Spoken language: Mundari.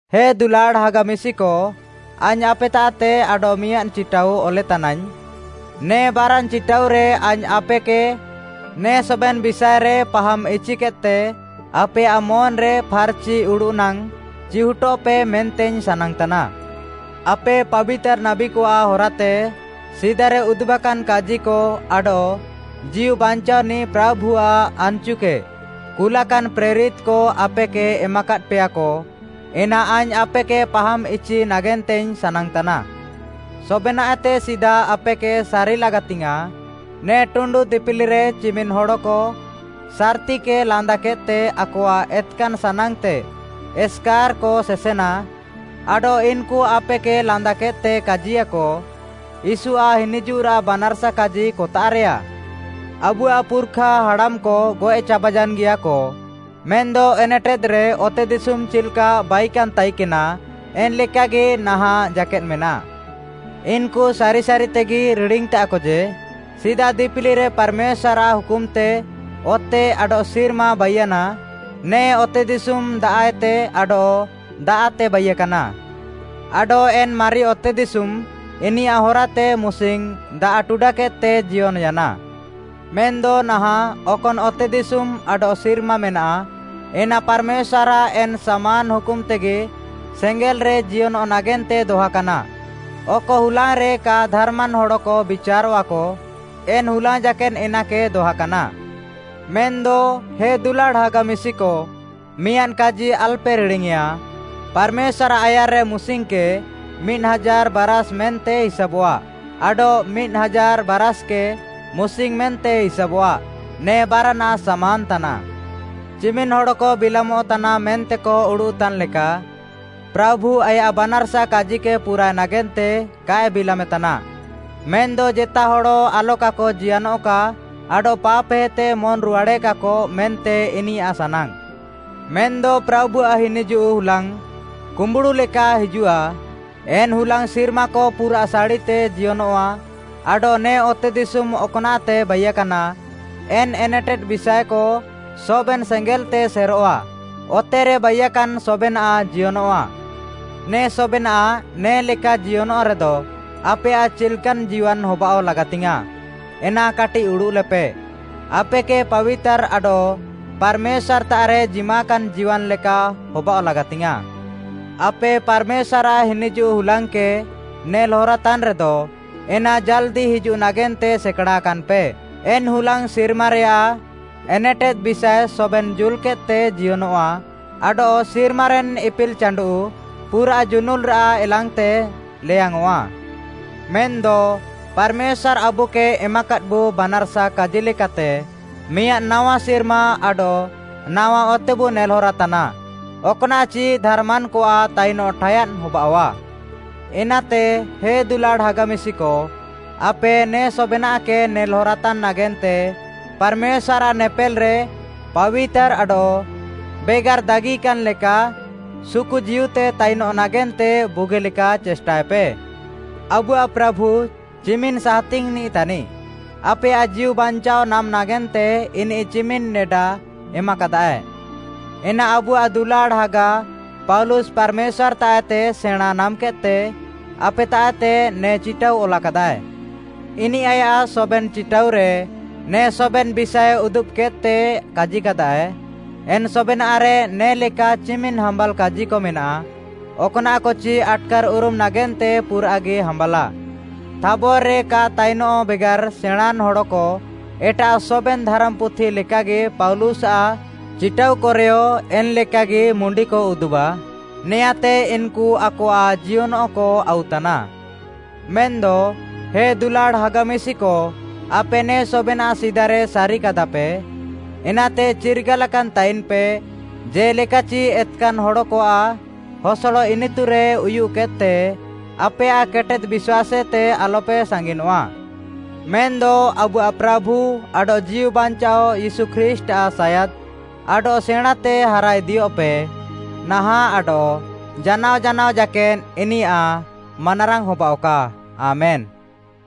ହେ ଦୁଲାଡ଼୍‌ ହାଗା ମିଶିକ, ଆଇଙ୍ଗ୍‌ ଆପେତାଃତେ ଆଡଃମିଆଁଦ୍‌ ଚିଟାଉ ଅଲେତାନାଇଙ୍ଗ୍‌। ନେ ବାରାନ୍‌ ଚିଟାଉରେ ଆଇଙ୍ଗ୍‌ ଆପେକେ ନେ ସବେନ୍‌ ବିଷାଏରେ ପାହାମ୍‌ ଇଚିକେଦ୍‌ତେ ଆପେୟାଃ ମନ୍‌ରେ ଫାର୍‌ଚି ଉଡ଼ୁଃ ନାଙ୍ଗ୍‌ ଚିହୁଟଃପେ ମେନ୍ତେଇଙ୍ଗ୍‌ ସାନାଙ୍ଗ୍‌ତାନା। ଆପେ ପାବିତାର୍‌ ନାବୀକଆଃ ହରାତେ ସିଦାରେ ଉଦୁବାକାନ୍‌ କାଜିକ ଆଡଃ ଜୀଉ ବାଞ୍ଚାଅନିଃ ପ୍ରାଭୁଆଃ ଆନ୍‌ଚୁକେ କୁଲାକାନ୍‌ ପ୍ରେରିତ୍‌କ ଆପେକେ ଏମାକାଦ୍‌ପେୟାକ, ଏନା ଆଇଙ୍ଗ୍‌ ଆପେକେ ପାହାମ୍‌ଇଚି ନାଗେନ୍ତେଇଙ୍ଗ୍‌ ସାନାଙ୍ଗ୍‌ତାନା। ସବେନାଃଏତେ ସିଦା ଆପେକେ ସାରି ଲାଗାତିଙ୍ଗ୍‌ୟାଁଃ, ନେ ଟୁଣ୍ଡୁ ଦିପିଲିକରେ ଚିମିନ୍‌ ହଡ଼କ ସାର୍‌ତିକେ ଲାନ୍ଦାକେଦ୍‌ତେ ଆକଆଃ ଏତ୍‌କାନ୍‌ ସାନାଙ୍ଗ୍‌ତେ ଏସ୍‌କାର୍‌କ ସେସେନା, ଆଡଃ ଇନ୍‌କୁ ଆପେକେ ଲାନ୍ଦାକେଦ୍‌ତେ କାଜିୟାକ, “ୟୀଶୁଆଃ ହିନିଜୁଃରାଃ ବାନାର୍‌ସା କାଜି କତାଃରେୟା? ଆବୁଆଃ ପୁର୍‌ଖା ହାଡ଼ାମ୍‌କ ଗଏଃ ଚାବାୟାନ୍‌ଗିୟାକ, ମେନ୍‌ଦ ଏନେଟେଦ୍‌ରେ ଅତେଦିଶୁମ୍‌ ଚିଲ୍‌କା ବାଇକାନ୍‌ ତାଇକେନା ଏନ୍‌ଲେକାଗି ନାହାଁଃ ଜାକେଦ୍‌ ମେନାଃ।” ଇନ୍‌କୁ ସାରିସାରିତେଗି ରିଡ଼ିଙ୍ଗ୍‌ତାଃକ ଯେ, ସିଦା ଦିପିଲିରେ ପାର୍‌ମେଶ୍ୱାର୍‌ଆଃ ହୁକୁମ୍‌ତେ ଅତେ ଆଡଃ ସିର୍ମା ବାଇୟାନା। ନେ ଅତେଦିଶୁମ୍‌ ଦାଆଃଏତେ ଆଡଃ ଦାଆଃତେ ବାଇୟାକାନା। ଆଡଃ ଏନ୍‌ ମାରି ଅତେଦିଶୁମ୍‌ ଇନିୟାଃ ହରାତେ ମୁସିଙ୍ଗ୍‌ ଦାଆଃ ଟୁଡାକେଦ୍‌ତେ ଜିୟନ୍‌ୟାନା। ମେନ୍‌ଦ ନାହାଁଃ ଅକନ୍‌ ଅତେଦିଶୁମ୍‌ ଆଡଃ ସିର୍ମା ମେନାଃ, ଏନା ପାର୍‌ମେଶ୍ୱାର୍‌ଆଃ ଏନ୍‌ ସାମାନ୍‌ ହୁକୁମ୍‌ତେଗି ସେଙ୍ଗେଲ୍‌ରେ ଜିୟନଃ ନାଗେନ୍ତେ ଦହାକାନା। ଅକ ହୁଲାଙ୍ଗ୍‌ରେ କା ଧାର୍‌ମାନ୍‌ ହଡ଼କ ବିଚାରଃଆକ, ଏନ୍‌ ହୁଲାଙ୍ଗ୍‌ ଜାକେଦ୍‌ ଏନାକେ ଦହାକାନା। ମେନ୍‌ଦ ହେ ଦୁଲାଡ଼୍‌ ହାଗା ମିଶିକ, ମିଆଁଦ୍‌ କାଜି ଆଲ୍‌ପେ ରିଡ଼ିଙ୍ଗ୍‌ୟେଁଆ, ପାର୍‌ମେଶ୍ୱାର୍‌ଆଃ ଆୟାର୍‌ରେ ମୁସିଙ୍ଗ୍‌କେ, ମିଦ୍‌ ହାଜାର୍‌ ବାରାଷ୍‌ ମେନ୍ତେ ହିସାବଃଆ ଆଡଃ ମିଦ୍‌ ହାଜାର୍‌ ବାରାଷ୍‌କେ, ମୁସିଙ୍ଗ୍‌ ମେନ୍ତେ ହିସାବଃଆ। ନେ ବାରାନାଃ ସାମାନ୍‌ ତାନାଃ। ଚିମିନ୍‌ ହଡ଼କ ବିଲାମଃ ତାନାଃ ମେନ୍ତେକ ଉଡ଼ୁଃତାନ୍‌ ଲେକା, ପ୍ରାଭୁ ଆୟାଃ ବାନାର୍‌ସା କାଜିକେ ପୁରାଏ ନାଗେନ୍ତେ କାଏ ବିଲାମେ ତାନା, ମେନ୍‌ଦ ଜେତା ହଡ଼ ଆଲକାକ ଜିୟନଃକା ଆଡଃ ପାପ୍‌ହେତେ ମନ୍‌ ରୁହାଡ଼େକାକ ମେନ୍ତେ ଇନିୟାଃ ସାନାଙ୍ଗ୍‌। ମେନ୍‌ଦ ପ୍ରାଭୁଆଃ ହିନିଜୁଃ ହୁଲାଙ୍ଗ୍‌ କୁମ୍ୱୁଡ଼ୁଲେକା ହିଜୁଃଆ। ଏନ୍‌ ହୁଲାଙ୍ଗ୍‌ ସିର୍ମାକ ପୁରାଃ ସାଡ଼ିତେ ଜିୟନଃଆ, ଆଡଃ ନେ ଅତେଦିଶୁମ୍‌ ଅକ୍‌ନାଃତେ ବାଇକାନା, ଏନ୍‌ ଏନେଟେଦ୍‌ ବିଷାଏକ ସବେନ୍‌ ସେଙ୍ଗେଲ୍‌ତେ ସେରଃଆ, ଅତେରେ ବାଇୟାକାନ୍‌ ସବେନାଃ ଜିୟନଃଆ। ନେ ସବେନାଃ ନେ'ଲେକା ଜିୟନଃରେଦ, ଆପେୟାଃ ଚିଲ୍‌କାନ୍‌ ଜୀୱାନ୍‌ ହବାଅଃ ଲାଗାତିଙ୍ଗ୍‌ୟାଁଃ, ଏନା କାଟିଃ ଉଡ଼ୁଃଲେପେ। ଆପେକେ ପାବିତାର୍‌ ଆଡଃ ପାର୍‌ମେଶ୍ୱାର୍‌ତାଃରେ ଜିମାକାନ୍‌ ଜୀୱାନ୍‌ ଲେକା ହବାଅଃ ଲାଗାତିଙ୍ଗ୍‌ୟାଁଃ। ଆପେ ପାର୍‌ମେଶ୍ୱାର୍‌ଆଃ ହିନିଜୁଃ ହୁଲାଙ୍ଗ୍‌କେ ନେଲ୍‌ ହରାତାନ୍‌ରେଦ, ଏନା ଜାଲ୍‌ଦି ହିଜୁଃ ନାଗେନ୍ତେ ସେକାଡ଼ାକାନ୍‌ପେ। ଏନ୍‌ ହୁଲାଙ୍ଗ୍‌ ସିର୍ମାରେୟାଃ ଏନେଟେଦ୍‌ ବିଷାଏ ସବେନ୍‌ ଜୁଲ୍‌କେଦ୍‌ତେ ଜିୟନଃଆ ଆଡଃ ସିର୍ମାରେନ୍‌ ଇପିଲ୍‌ ଚାଣ୍ଡୁଃ ପୁରାଃ ଜୁନୁଲ୍‌ରାଃ ଏଲାଙ୍ଗ୍‌ତେ ଲେୟାଙ୍ଗ୍‌ଅଁଃଆ। ମେନ୍‌ଦ ପାର୍‌ମେଶ୍ୱାର୍‌ ଆବୁକେ ଏମାକାଦ୍‌ବୁ ବାନାର୍‌ସା କାଜିଲେକାତେ, ମିଆଁଦ୍‌ ନାୱା ସିର୍ମା ଆଡଃ ନାୱା ଅତେବୁ ନେଲ୍‌ହରାତାନା, ଅକ୍‌ନାଃଚି ଧାର୍‌ମାନ୍‌କଆଃ ତାଇନଃ ଠାୟାଦ୍‌ ହବାଅଃଆ। ଏନାତେ ହେ ଦୁଲାଡ଼୍‌ ହାଗା ମିଶିକ, ଆପେ ନେ ସବେନାଃକେ ନେଲ୍‌ହରାତାନ୍‌ ନାଗେନ୍ତେ ପାର୍‌ମେଶ୍ୱାର୍‌ଆଃ ନେପେଲ୍‌ରେ ପାବିତାର୍‌ ଆଡଃ ବେଗାର୍‌ ଦାଗିକାନ୍‌ ଲେକା ସୁକୁଜୀଉତେ ତାଇନଃ ନାଗେନ୍ତେ ବୁଗିଲେକା ଚେଷ୍ଟାଏପେ। ଆବୁଆଃ ପ୍ରାଭୁ ଚିମିନ୍‌ ସାହାତିଙ୍ଗ୍‌ନିଃ ତାନିଃ। ଆପେୟାଃ ଜୀଉବାଞ୍ଚାଅ ନାମ୍‌ ନାଗେନ୍ତେ ଇନିଃ ଚିମିନ୍‌ ନେଡା ଏମାକାଦାଏ, ଏନା ଆବୁଆଃ ଦୁଲାଡ଼୍‌ ହାଗା, ପାଉଲୁସ୍‌ ପାର୍‌ମେଶ୍ୱାର୍‌ତାଃଏତେ ସେଣାଁଁ ନାମ୍‌କେଦ୍‌ତେ ଆପେତାଃତେ ନେ ଚିଟାଉ ଅଲାକାଦାଏ। ଇନିଃ ଆୟାଃ ସବେନ୍‌ ଚିଟାଉରେ, ନେ ସବେନ୍‌ ବିଷାଏ ଉଦୁବ୍‌କେଦ୍‌ତେ କାଜିକାଦାଏ, ଏନ୍‌ ସବେନାଃରେ ନେ'ଲେକା ଚିମିନ୍‌ ହାମ୍ୱାଲ୍‌ କାଜିକ ମେନାଃ, ଅକ୍‌ନାଃକଚି ଆଟ୍‌କାର୍‌ଉରୁମ୍‌ ନାଗେନ୍ତେ ପୁରାଃଗି ହାମ୍ବାଲାଃ। ଥାବର୍‌ରେ କା ତାଇନଃ ବେଗାର୍‌ ସେଣାଁଁନ୍‌ ହଡ଼କ ଏଟାଃ ସବେନ୍‌ ଧାରାମ୍‌ପୁଥି ଲେକାଗି ପାଉଲୁସ୍‌ଆଃ ଚିଟାଉକରେୟ ଏନ୍‌ଲେକାଗି ମୁଣ୍ଡିକ ଉଦୁବାଃ। ନେଆଁଁତେ ଇନ୍‌କୁ ଆକଆଃ ଜିୟନଃକ ଆଉତାନା। ମେନ୍‌ଦ ହେ ଦୁଲାଡ଼୍‌ ହାଗା ମିଶିକ, ଆପେ ନେ ସବେନାଃ ସିଦାରେ ସାରିକାଦାପେ। ଏନାତେ ଚିର୍ଗାଲାକାନ୍‌ ତାଇନ୍‌ପେ, ଜେ'ଲେକା ଏତ୍‌କାନ୍‌ ହଡ଼କଆଃ ହସଡ଼ ଇନିତୁରେ ଉୟୁଃକେଦ୍‌ତେ ଆପେୟାଃ କେଟେଦ୍‌ ବିଶ୍ୱାସ୍‌ଏତେ ଆଲପେ ସାଙ୍ଗିନଃଆ। ମେନ୍‌ଦ ଆବୁଆଃ ପ୍ରାଭୁ ଆଡଃ ଜୀଉବାଞ୍ଚାଅ ୟୀଶୁ ଖ୍ରୀଷ୍ଟ୍‌ଆଃ ସାୟାଦ୍‌ ଆଡଃ ସେଣାଁଁତେ ହାରାଇଦିଅଃପେ। ନାହାଁଃ ଆଡଃ ଜାନାଅ ଜାନାଅ ଜାକେଦ୍‌ ଇନିୟାଃ ମାନାରାଙ୍ଗ୍‌ ହବାଅଃକା, ଆମେନ୍‌।